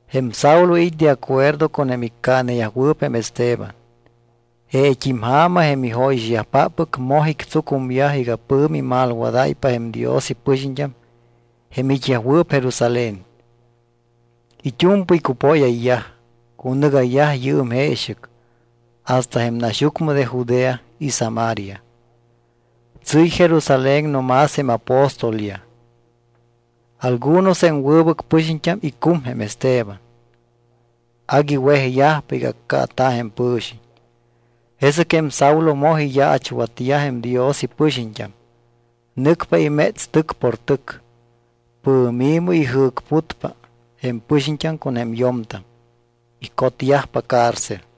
Jém Saulo it́ de acuerdo con jém iccaaneyajwɨɨp jém Esteban. Jeet́im ja̱ma jém ijóyixyajpáppɨc moj ictsucumyaj iga pɨ̱mi imalwadáypa jém Dios ipɨxiñt́am jém it́yajwɨɨp Jerusalén. It́u̱mpɨy cupóyayyaj. Cunɨgayyaj yɨɨm jeexɨc hasta jém naxyucmɨ de Judea y Samaria. Tsɨ́y Jerusalén no más jém apóstolyaj. Algunos jém wɨbɨc pɨxiñt́am icum jém Esteban. Agui wejyajpa iga accaata̱ jém pɨ̱xiñ. Jesɨc jém Saulo moj iyaachwatyaj jém Dios ipɨxiñt́am. Nɨcpa iméts tɨc por tɨc. Pɨ̱mi̱mɨ ijɨ̱cputpa jém pɨxiñt́am con jém yo̱mtam. Icotyajpa cárcel.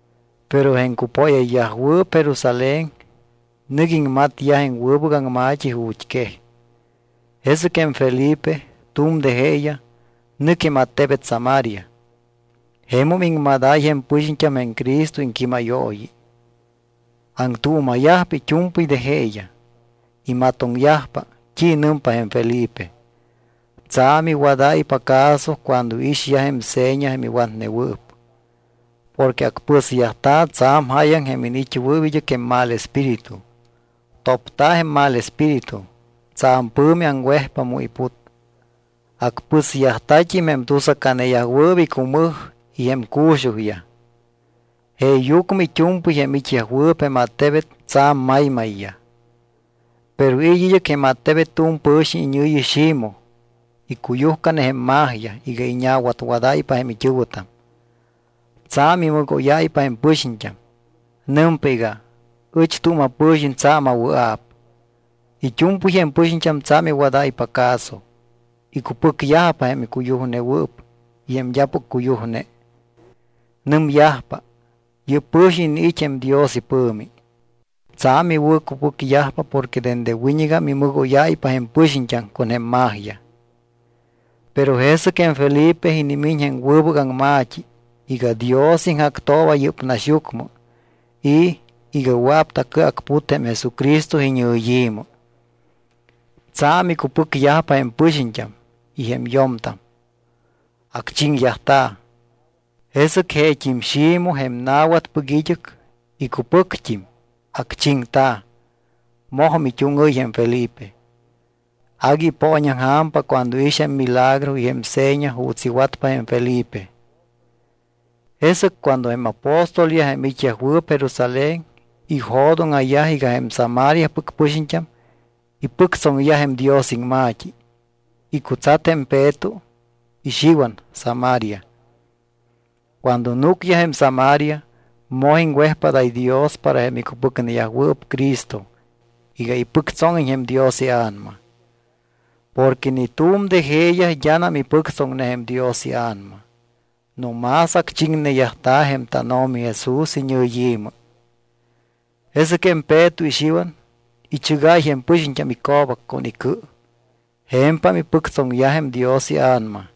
Pero jém cupóyayyajwɨɨp Jerusalén nɨc iŋmatyaj jém wɨbɨc aŋma̱t́i ju̱t́ quej. Jesɨc jém Felipe, tu̱m de jeeyaj, nɨc jém attebet Samaria. Jemum iŋmadáy jém pɨxiñt́am jém Cristo iŋquímayooyi. Aŋtuuma̱yajpa it́u̱mpɨy de jeeyaj, imatoŋyajpa t́i nɨmpa jém Felipe. Tsa̱m iwadáypa caso cuando iixyaj jém seña jém iwatnewɨɨp. Porque acpɨsyajta̱ tsa̱m jáyaŋ jém iniit́wɨɨp id́ɨc jém mal espíritu. Topta̱ jém mal espíritu. Tsa̱m pɨ̱mi aŋwejpa mu iput. Acpɨsyajta̱t́im jém tusacaneyajwɨɨp icumɨj y jém cu̱xujyaj. Jeeyucmɨ it́u̱mpɨy jém it́yajwɨɨp jém attebet tsa̱m maymayyaj. Pero it́ id́ɨc jém attebet tu̱m pɨ̱xiñ iñɨ̱yi, Ximoj. Icuyujcane jém magia iga iña̱watwadáypa jém it́ɨ̱wɨtam. Tsa̱m imɨgóyáypa jém pɨxiñt́am. Nɨmpa iga: “Ɨch tu̱m apɨ̱xiñ tsa̱m awɨa̱p.” It́u̱mpɨy jém pɨxiñt́am tsa̱m iwadáypa caso. Icupɨcyajpa jém cuyujnewɨɨp y jém d́apɨc cuyujne. Nɨmyajpa: —Yɨ́p pɨ̱xiñ iniit́ jém Dios ipɨ̱mi. Tsa̱m iwɨ̱cupɨcyajpa porque dende wiñɨgam imɨgóyáypa jém pɨxiñt́am con jém magia. Pero jesɨc jém Felipe inimiñ jém wɨbɨc aŋma̱t́i iga Dios iŋjactooba yɨ́p naxyucmɨ y iga wɨa̱p tacɨacput jém Jesucristo iñɨyi̱mɨ. Tsa̱m icupɨcyaj jém pɨxiñt́am y jém yo̱mtam. Acchiŋyajta̱. Jesɨc jeet́im Ximoj, jém na̱watpɨc id́ɨc, icupɨct́im. Acchiŋta̱. Mojum it́úŋɨ́y jém Felipe. Agui ipooñaŋja̱mpa cuando iix jém milagro y jém seña juuts iwatpa jém Felipe. Jesɨc cuando jém apóstolyaj jém it́yajwɨɨp Jerusalén ijo̱dóŋa̱yaj iga jém Samariapɨc pɨxiñt́am ipɨctsoŋyaj jém Dios iŋma̱t́i, icutsat jém Peto y Xiwan Samaria. Cuando núcyaj jém Samaria, moj iŋwejpádáy Dios para jém icupɨcneyajwɨɨp Cristo iga ipɨctsóŋiñ jém Dios iA̱nama. Porque ni tu̱m de jeeyaj d́anam ipɨctsoŋne jém Dios iA̱nama. No más acchiŋneyajta̱ jém tánO̱mi Jesús iñɨyi̱mɨ. Jesɨc jém Peto y Xiwan ichɨgáy jém pɨxiñt́am ico̱bac con icɨ. Je̱mpam ipɨctsoŋyaj jém Dios iA̱nama.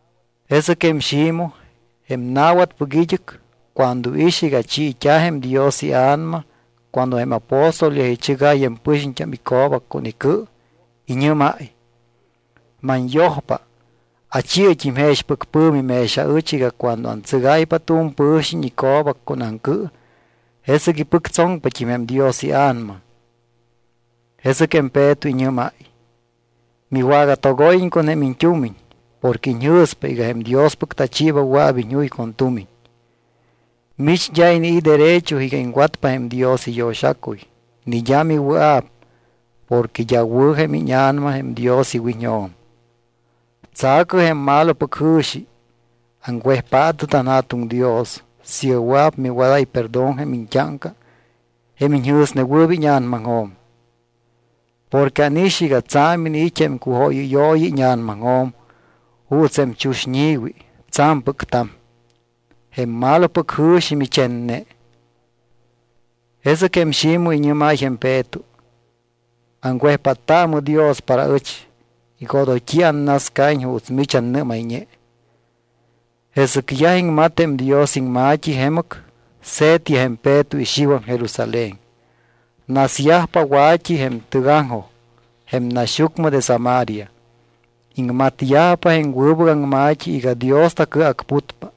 Jesɨc jém Ximoj, jém na̱watpɨc id́ɨc, cuando iix iga chiit́a̱ jém Dios iA̱nama cuando jém apóstolyaj ichɨgáy jém pɨxiñt́am ico̱bac con icɨ, iñɨ́máy: —Manyojpa. Achi̱ɨt́im jexpɨc pɨ̱mi mex aɨch iga cuando antsɨgáypa tu̱m pɨ̱xiñ ico̱bac con aŋcɨ, jesɨc ipɨctsoŋpat́im jém Dios iA̱nama. Jesɨc jém Peto iñɨ́máy: —Miwagatogóyiñ con jém iñt́umiñ porque iñjɨ̱spa iga jém Diospɨc tachiiba wɨa̱p iñjuy con tumiñ. Mich d́a inii̱ derecho iga iŋwatpa jém Dios iyo̱xacuy ni d́a miwɨa̱p porque d́a wɨ̱ jém íña̱nama jém Dios iwiñjo̱m. Tsa̱cɨ jém malopɨc jɨ̱xi. Aŋwejpaatɨ tanJa̱tuŋ Dios siiga wɨa̱p miwadáy perdón jém iñt́áŋca jém iñjɨ̱snewɨɨp íña̱namaŋjo̱m. Porque ánix iga tsa̱m iniit́ jém cujóyɨyooyi íña̱namaŋjo̱m juuts jém chuxñi̱wi tsa̱mpɨc ta̱m. Jém malopɨc jɨ̱xi michenne. Jesɨc jém Ximoj iñɨ́máy jém Peto: —Aŋwejpáttaamɨ Dios para ɨch iga odoy t́i annascaiñ juuts mich annɨ́mayñe. Jesɨc yaj iŋmat jém Dios iŋma̱t́i jemɨc, se̱tyaj jém Peto y Xiwan Jerusalén. Nasyajpa wa̱t́i jém tɨgaŋjoj jém naxyucmɨ de Samaria. Iŋmatyajpa jém wɨbɨc aŋma̱t́i iga Dios tacɨacputpa.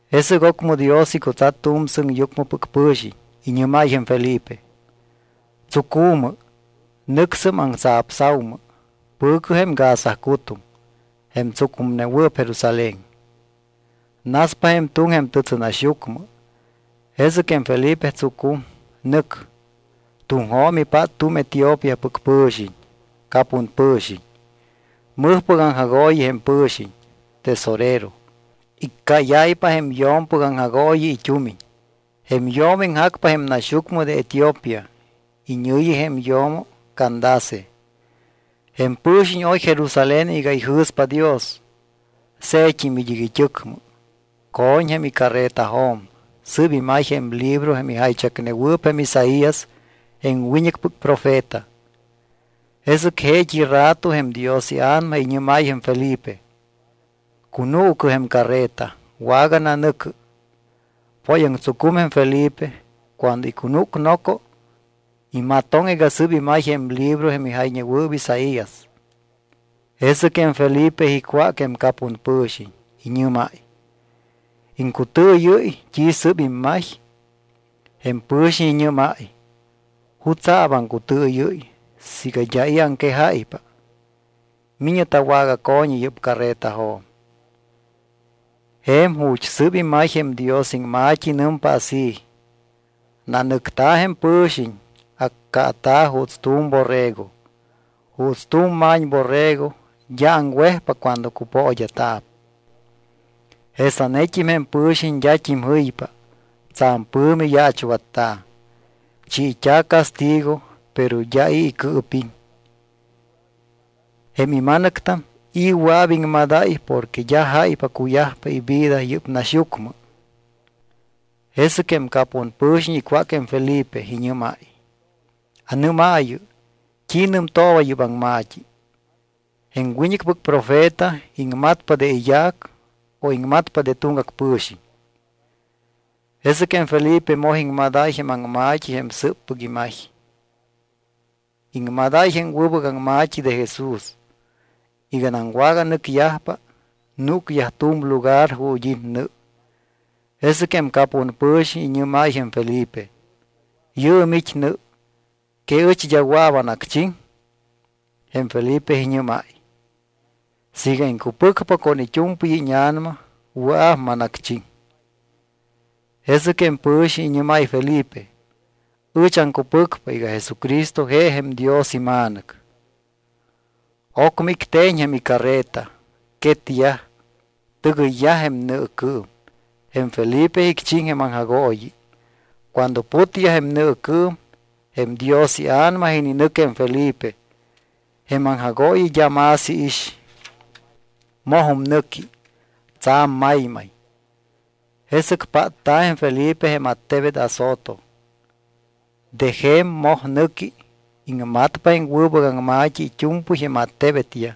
Jesɨc ocmɨ Dios icutsat tu̱m sɨŋyucmɨpɨc pɨ̱xiñ. Iñɨ́máy jém Felipe: —Tsucu̱mɨ. Nɨcsɨm aŋtsapsa̱umɨ. Pɨ̱cɨ jém Gaza cu̱tuŋ, jém tsucumnewɨɨp Jerusalén. Naspa jém tuŋ jém tɨtsɨnaxyucmɨ. Jesɨc jém Felipe tsucum. Nɨc. Tuŋjo̱m ipát tu̱m Etiopíapɨc pɨ̱xiñ. Capun pɨ̱xiñ. Mɨjpɨc aŋjagooyi jém pɨ̱xiñ, tesorero. Iccáyáypa jém yo̱mpɨc aŋjagooyi it́umiñ. Jém yo̱mo iŋjacpa jém naxyucmɨ de Etiopía. Iñɨ̱yi jém yo̱mo Candace. Jém pɨ̱xiñ oy Jerusalén iga ijɨ̱spa Dios. Se̱tt́im id́ɨc it́ɨcmɨ, co̱ñ jém icarretajo̱m, sɨ́p imay jém libro jém ijaychacnewɨɨp jém Isaías jém wiñɨcpɨc profeta. Jesɨc jeet́i rato jém Dios iA̱nama iñɨ́máy jém Felipe: —Cunuucɨ jém carreta, wagananɨ̱cɨ. Póyaŋtsucum jém Felipe, cuando icunúc noco, imatoŋ iga sɨ́p imay jém libro jém ijayñewɨɨp Isaías. Jesɨc jém Felipe icwác jém capun pɨ̱xiñ, iñɨ́máy: —¿Iŋcutɨɨyɨ́y t́i sɨ́p immay? Jém pɨ̱xiñ iñɨ́máy: —¿Jutsa̱p aŋcutɨɨyɨ́y siiga d́a i̱ aŋquejáypa? Mi̱ñɨ tawagaco̱ñi yɨ́p carretajo̱m. Je̱m ju̱t́ sɨ́p imay jém Dios iŋma̱t́i nɨmpa así: Nanɨcta̱ jém pɨ̱xiñ, accaata̱ juuts tu̱m borrego juuts tu̱m ma̱ñborrego d́a aŋwejpa cuando cupood́a̱ta̱p, jesanet́im jém pɨ̱xiñ d́at́im jɨypa. Tsa̱m pɨ̱mi yaachwatta̱, chiit́a̱ castigo, pero d́a i̱ icɨɨpiŋ. ¿Jém ima̱nɨctam, i̱ wɨa̱p iŋmadáy porque d́a jáypa cuyajpa ivida yɨ́p naxyucmɨ? Jesɨc jém capun pɨ̱xiñ icwác jém Felipe. Iñɨ́máy: —¿Anɨ́maayɨ, t́i nɨmtooba yɨ́p aŋma̱t́i? ¿Jém wiñɨcpɨc profeta, iŋmatpa de iyaac o iŋmatpa de tuŋgac pɨ̱xiñ? Jesɨc jém Felipe moj iŋmadáy jém aŋma̱t́i jém sɨɨppɨc imay. Iŋmadáy jém wɨbɨc aŋma̱t́i de Jesús. Iganam waganɨcyajpa, núcyaj tu̱m lugar ju̱t́ it́ nɨ. Jesɨc jém capun pɨ̱xiñ iñɨ́máy jém Felipe: —Yɨɨm it́ nɨ. ¿Que ɨch d́a wɨa̱p anacchiŋ? Jém Felipe iñɨ́máy: —Siiga iŋcupɨcpa con it́u̱mpɨy íña̱nama, wɨa̱p manacchiŋ. Jesɨc jém pɨ̱xiñ iñɨ́máy Felipe: —Ɨch aŋcupɨcpa iga Jesucristo je jém Dios iMa̱nɨc. Ocmɨ icte̱ñ jém icarreta. Quetyaj, tɨgɨyyaj jém nɨɨcɨɨm. Jém Felipe icchiŋ jém aŋjagooyi. Cuando putyaj jém nɨɨcɨɨm, jém Dios iA̱nama ininɨc jém Felipe. Jém aŋjagooyi d́a más iix. Mojum nɨqui, tsa̱m maymay. Jesɨc pátta̱ jém Felipe jém attebet Azoto. De je̱m moj nɨqui. Iŋmatpa jém wɨbɨc aŋma̱t́i it́u̱mpɨy jém attebetyaj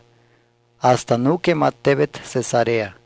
hasta núc jém attebet Cesarea.